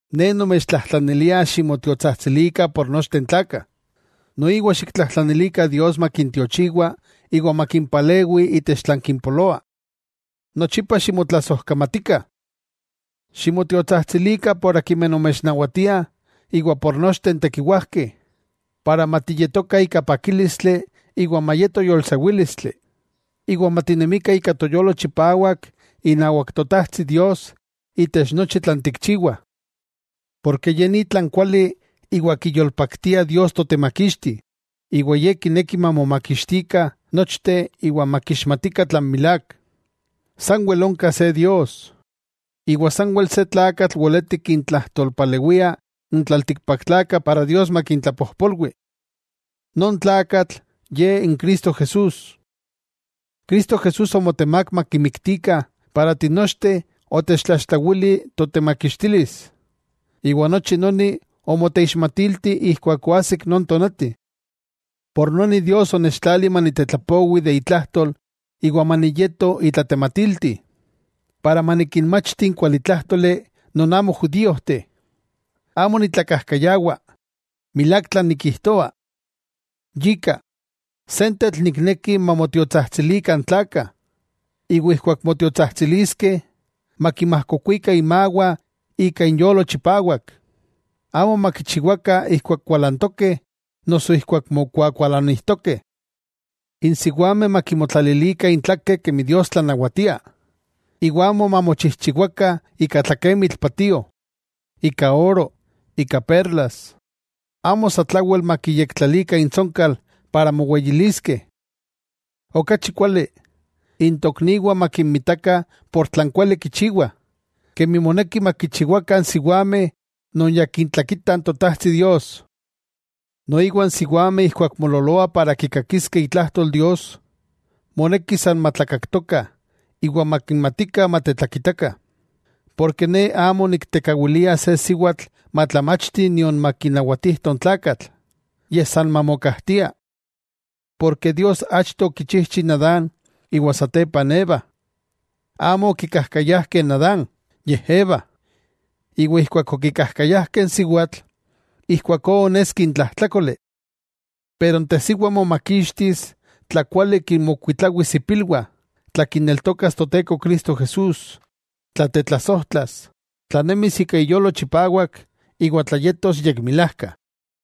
Ne nomechtlajtlanilia ximotiotsajtsilikah por nochteh n tlakah, noiwa xiktlajtlanilikah Dios makintiochiwa iwa makimpalewi itech tlan kimpoloah. Nochipa ximotlasojkamatikah. Ximotiotsajtsilikah por akimeh nomechnawatiah iwa por nochteh n tekiwajkeh, para matiyetokah ika pakílistli iwa mayeto yolsewílistli, iwa matinemikah ika toyolo chipawak inawak Totajtsi Dios itech nochi tlan tikchiwah. Porke ye ni tlan kuali iwa kiyolpaktia Dios Totemakixti, Ye kineki mamomakixtikah nochteh iwa makixmatikah tlan milák. Sanwel onka se Dios, iwa sanwel se Tlakatl weleti kintlajtolpalewia n tlaltikpaktlakah para Dios makintlapojpolwi: non Tlakatl, Ye n Cristo Jesús. Cristo Jesús omotemák makimiktikah para tinochteh otechtlaxtlawili totemakixtilis, iwa nochi noni omoteixmatilti keman oajsik non tonati. Yika Dios onechtlali manitetlapowi itlajtol iwa maniyeto itlatematilti, para manikinmachti n kualitlájtoli non amo judíojteh. Amo nitlakajkayawa, milák tlan nikijtoa. Yika, sentetl nikneki mamotiotsajtsilikah n tlakah. Iwa ijkuak motiotsajtsiliskeh, makinmajkokuikah inmawah ika inyolo chipawak, amo makichiwakah ijkuak kualantokeh noso ijkuak mokuakualanijtokeh. N siwameh makimotlalilikah intlakeh kemi Dios tlanawatia, iwa amo mamochijchiwakah ika tlakemitl patio, ika oro, ika perlas, amo satlawel makiyektlalikah intsonkal para moweyiliskeh. Okachi kuali, n tokniwah makinmitakah por tlan kuali kichiwah, kemi moneki makichiwakah n siwameh non ya kitlakitah n Totajtsi Dios. Noiwa n siwameh ijkuak moololoah para kikakiskeh itlajtol Dios, moneki san matlakaktokah iwa makimatikah matetlakitakah. Porke ne amo niktekawilia se siwatl matlamachti nion makinawatijto n tlakatl, yej san mamokajtia. Porke Dios achto okichijchi Adán, iwa satepa n Eva. Amo okikajkayajkeh Adán, yej Eva, iwa ijkuak okikajkayajkeh n siwatl, ijkuakó oneski n tlajtlákoli. Pero n tesiwa momakixtis tla kuali kinmokuitlawis ipilwah, tla kineltokas Toteko Cristo Jesús, tla tetlasojtlas, tla nemis ika iyolo chipawak iwa mayeto yekmilajka.